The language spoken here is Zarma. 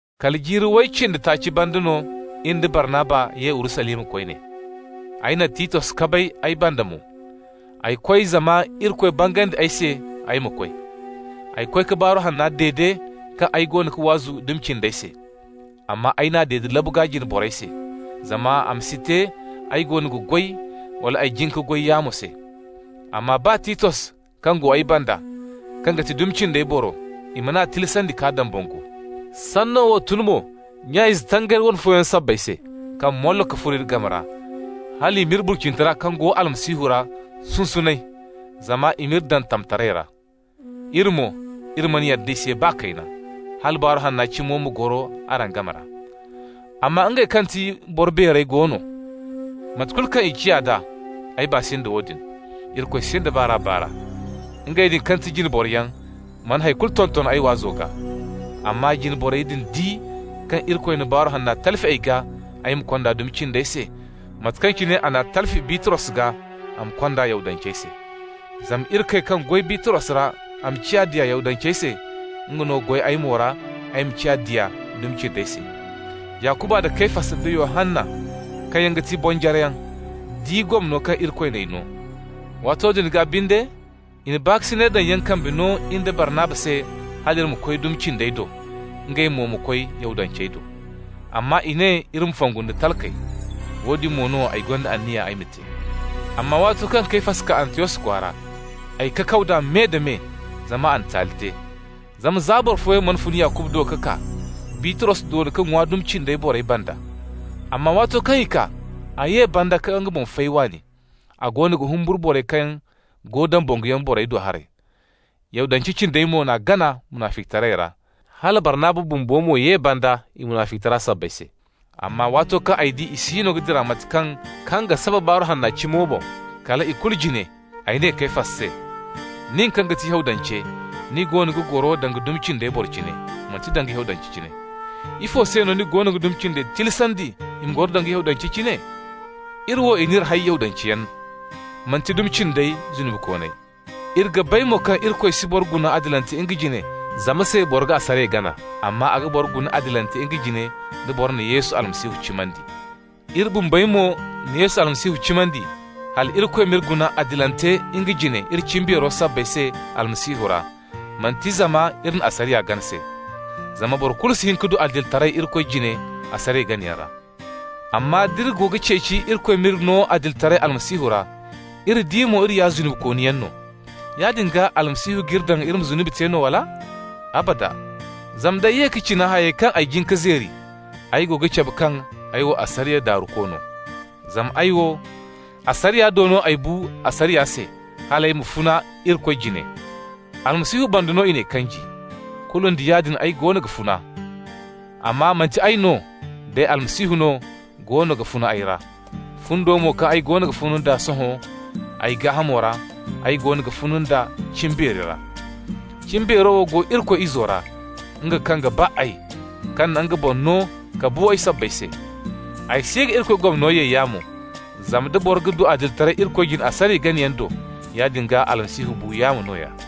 Kala jiiri way cindi taaci banda no in da Barnaba ye Urusalima koyne. Ay na Titos kabay ay banda mo. Ay koy zama Irikoy bangandi ay se ay ma koy. Ay koy ka Baaru Hanna dede kaŋ ay goono ga waazu dumi cindey se. Amma ay n'a dede labu gaa jine borey se, zama a ma si te ay goono ga goy, wala ay jin ka goy yaamo se. Amma baa Titos kaŋ go ay banda, kaŋ ga ti dumi cindey boro, i man'a tilasandi ka dambangu. Sanno wo tun mo nya-ize tangari wane fooyaŋ sabbay se kaŋ mollo ka furo iri game ra, hal i m'iri burcinitara kaŋ go Almasihu ra sunsunay, zama i m'iri daŋ tamtaray ra. Iri mo, iri mana yadda i se baa kayna, hala Baaru Hanna cimo ma goro araŋ game ra. Amma ngey kaŋ ga ti boro beerey go no. (Mate kulu kaŋ i ciya d'a, ay baa si nda woodin. Irikoy sinda baar'a-baar'a). Ngey din kaŋ ga ti jine boroyaŋ mana hay kulu tonton ay waazo gaa. Amma jine borey din di kaŋ Irikoy na Baaru Hanna talfi ay gaa ay ma kond'a dumi cindey se, mate kaŋ cine a n'a talfi Bitros gaa a ma kond'a Yahudancey se. Zama Irikoy kaŋ goy Bitros ra a ma ciya diya Yahudancey se, nga no goy ay mo ra ay ma ciya diya dumi cindey se. Yakuba nda Kefas da Yohanna, kaŋ yaŋ ga ti bonjareyaŋ di gomno kaŋ Irikoy n'ay no. Waato din gaa binde, i na baakasinay daŋyaŋ kambe no in da Barnaba se hal iri ma koy dumi cindey do, ngey mo ma koy Yahudancey do. Amma i ne iri ma fongu nda talkey. Woodin mo no ay gonda anniya ay ma te. Amma waato kaŋ Kefas kaa Antiyos kwaara, ay kakaw d'a me-da-me, zama a na taali te. Zama za boro fooyaŋ mana fun Yakuba do ka kaa, Bitros doona ka ŋwa dumi cindey borey banda. Amma waato kaŋ i kaa, a ye banda ka nga boŋ fay waani. A goono ga humburu borey kaŋ go dambanguyaŋ borey do haray. Yahudance cindey mo n'a gana munaficitaray ra, hala Barnaba bumbo mo ye banda i munaficitara sabbay se. Amma waato kaŋ ay di i siino ga dira nda mate kaŋ ga saba Baaru Hanna cimo boŋ, kala ikulu jine ay ne Kefas se: «Nin kaŋ ga ti Yahudance, ni goono ga goro danga dumi cindey boro cine, manti danga Yahudance cine. Ifo se no ni goono ga dumi cindey tilasandi i ma goro danga Yahudancey cine? Iri wo, i n'iri hay Yahudanceyaŋ, manti ‹dumi cindi zunubikooney›. Iri ga bay mo kaŋ Irikoy si boro guna adilante nga jine zama se bora ga asariya gana. Amma a ga boro guna adilante nga jine da bora na Yesu Almasihu cimandi. Iri bumbey mo na Almasihu Yesu cimandi, hal Irikoy m'iri guna adilante nga jine iri cimbeero sabbay se Almasihu ra, manti zama iri na asariya gana se. Zama boro kulu si hin ka du adilitaray Irikoy jine asariya ganayaŋ ra. Amma d'iri go ga ceeci Irikoy m'iri no adilitaray Almasihu ra, iri di mo iri ya zunubikooniyaŋ no, yaadin gaa Almasihu g'iri daŋ iri ma zunubi te no, wala? Abada! Zama nd'ay ye ka cina hayey kaŋ ay jin ka zeeri, ay go ga cabe kaŋ ay wo asariya daaruko no. Zama ay wo, asariya do no ay bu asariya se, hal ay ma funa Irikoy jine. Almasihu banda no i n'ay kanji. Kulu nda yaadin ay goono ga funa, amma manti ay no, day Almasihu no goono ga funa ay ra. Fundo mo kaŋ ay goono ga funa nd'a sohõ ay gaahamo ra, ay goono ga funa nd'a cimbeeri ra. Cimbeero wo go Irikoy Izo ra, nga kaŋ ga ba ay, kaŋ na nga boŋ no ka bu ay sabbay se. Ay si ga Irikoy gomno ye yaamo, zama nda boro ga du adilitaray Irikoy jine asariya ganayaŋ do, yaadin gaa Almasihu bu yaamo nooya.»